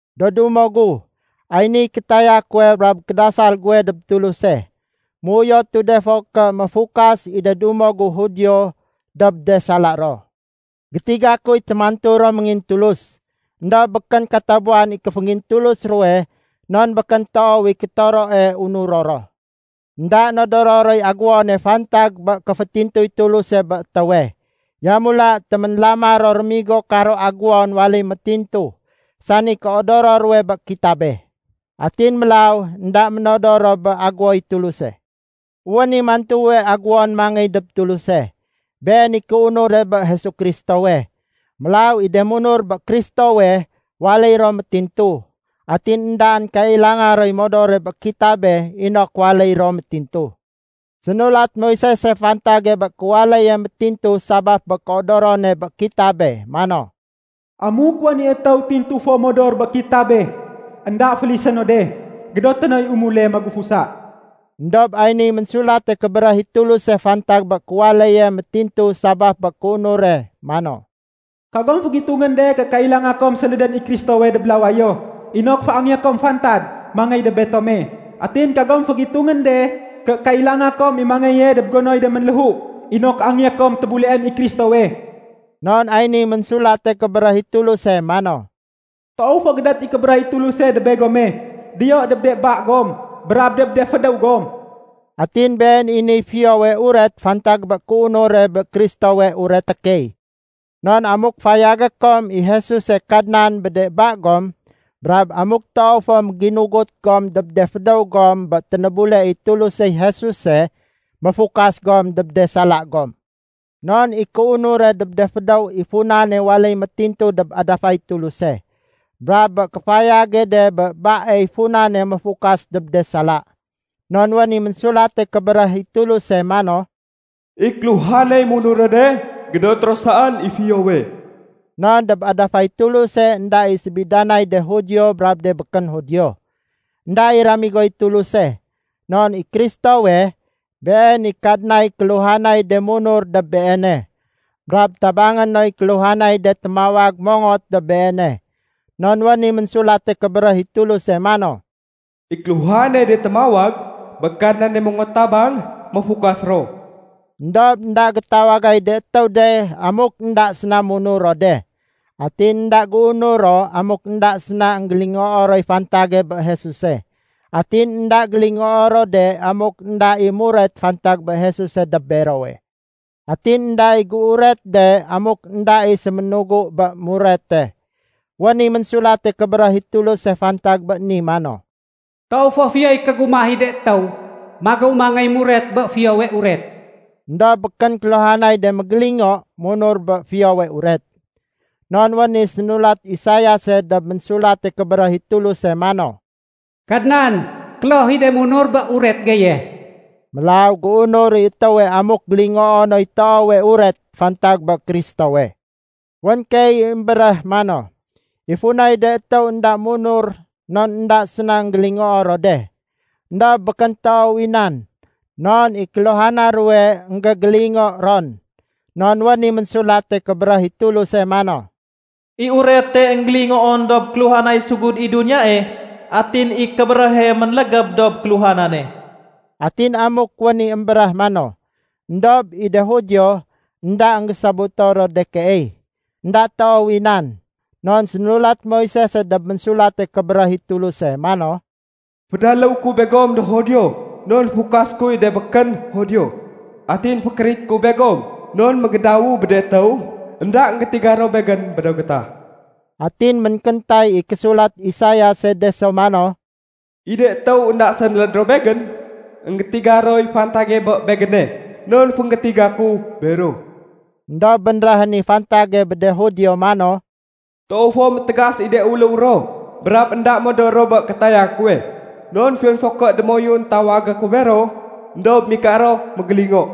Do dumo gu, ay niy kétaya kuwe brab kédasal guwe dob Tuluse: Méuyotu de fo ké méfukas i de dumo gu Judio dob de sala ro. Gétiga kuy témantu ro méngintulus, éndob békén katabuwan i kéféngintulus ruwe non békén toow i kétoroe unuro ro. Enda nodoro roy aguwone fantag bé kéfétintuy Tuluse bé étéwe. Yamula téménlama ro rémigo karo agéwon waléy métintu, sani kéodoro ruwe bé kitabe. Atin mélaw énda ménodor ro bé agéwoy Tuluse. Wén i mantuwe agéwon mangéy dob Tuluse. Been i kéunure bé Jesu Kristowe. Mélaw i de munur bé Kristowe waléy ro métintu. Atin éndaén kailanga roy modore bé kitabe inok waléy ro métintu. Sénulat Moisesey fantage bé kéwaléye métintu sabaf bé kéodorone bé kitabe mano, “Amuk wén i étéw tintu fo modor bé kitabe énda félisé no de, gédoté noy umule magufusa.” Endob ay niy Ménsulate Kébéréh i Tuluse fantag bé kéwaléye métintu sabaf bé kéunure mano, “Kagom fégitungén de ké kailanga kom sélédén i Kristowe dob lawayo inok féangéyé kom fantad mangéy dob betome. Atin kagom fégitungén de ké kailanga kom i mangéye dob gonoy de ménléhu inok angéyé kom tébuleén i Kristowe.” Non ay niy Ménsulate Kébéréh i Tuluse mano, “Toow fo gédét i kébéréh i Tuluse dob begome. Diyo dob de ba gom brab dob de fédéw gom.” Atin been i niy Fiyowe Uret fantag bé kéunure bé Kristowe ureté key. Non amuk fayagé kom i Jesuse Kadnan bé de ba gom, brab amuk toow fo méginugut gom dob de fédéw gom bé ténébule i Tulusey Jesuse, méfukas gom dob de sala gom. Non i kéunure dob de fédéw i funane waléy métintu dob adafay Tuluse. Brab bé kéfayage de bé baey funane méfukas dob de sala. Non wén i Ménsulate Kébéréh i Tuluse mano, “I kéluhanay munure de gédoté ro saén i fiyowe.” Non dob adafay Tuluse énda i sébidanay de Judio brab de békén Judio. Enda i ramigoy Tuluse. Non i Kristowe, Been i Kadnay kéluhanay de munur dob Beene, brab tabangé noy kéluhanay de témawag mongot dob Beene. Non wén i Ménsulate Kébéréh i Tuluse mano, “I kéluhanay de témawag bé Kadnane mongot tabang, méfukas ro.” Endob énda gétawagay de étéw de amuk énda séna munur ro de. Atin énda géunur ro amuk énda séna énggélingoo roy fantage bé Jesuse. Atin énda gélingoo ro de amuk énda i muret fantag bé Jesuse dob berowe. Atin énda i géuret de amuk énda i séménugu bé murete. Wén i Ménsulate Kébéréh i Tuluse fantag bé ni mano, “Toow fo fiyoy kégumah i de étéw magéw mangéy muret bé Fiyowe Uret.” Endob békén kéluhanay de mégélingo munur bé Fiyowe Uret. Non wén i sénulat Isaiase dob Ménsulate Kébéréh i Tuluse mano, “Kadnan, kloh i de munur bé uret geye.” Mélaw géunur i étéwe amuk gélingoo noy toowe uret fantag bé Kristowe. Wén keey i émbéréh mano, “I funay de étéw énda munur non énda séna énggélingoo ro de.” Endob békén toow i nan non i kéluhana ruwe énggégélingo ron. Non wén i Ménsulate Kébéréh i Tuluse mano, “I urete énggélingoon dob kéluhanay sugud i duniyae, atin i kébéréhe ménlégéb dob kéluhanane.” Atin amuk wén i émbéréh mano, “Endob i de Judio énda énggésobuto ro de keey,” énda toow i nan. Non sénulat Moisese dob Ménsulate Kébéréh i Tuluse mano, “Fédaléwé ku begom do Judio non fukasé kuy de békén Judio. Atin fékérité ku begom non mégédawu bé de étéw énda énggétiga ro Begén bé do gétah.” Atin ménkéntay i késulat Isaiase de so mano, “I de étéw énda sénléd ro Begén, énggétiga roy fantage bé Begéne non fénfégétiga ku bero.” Endob bénréhén i fantage bé de Judio mano, “Toow fo métégas i de uléw ro brab énda modor ro bé kétaya kuwe. Non fiyon fo ké démoyun tawagé ku bero, éndob mika ro mégélingo.”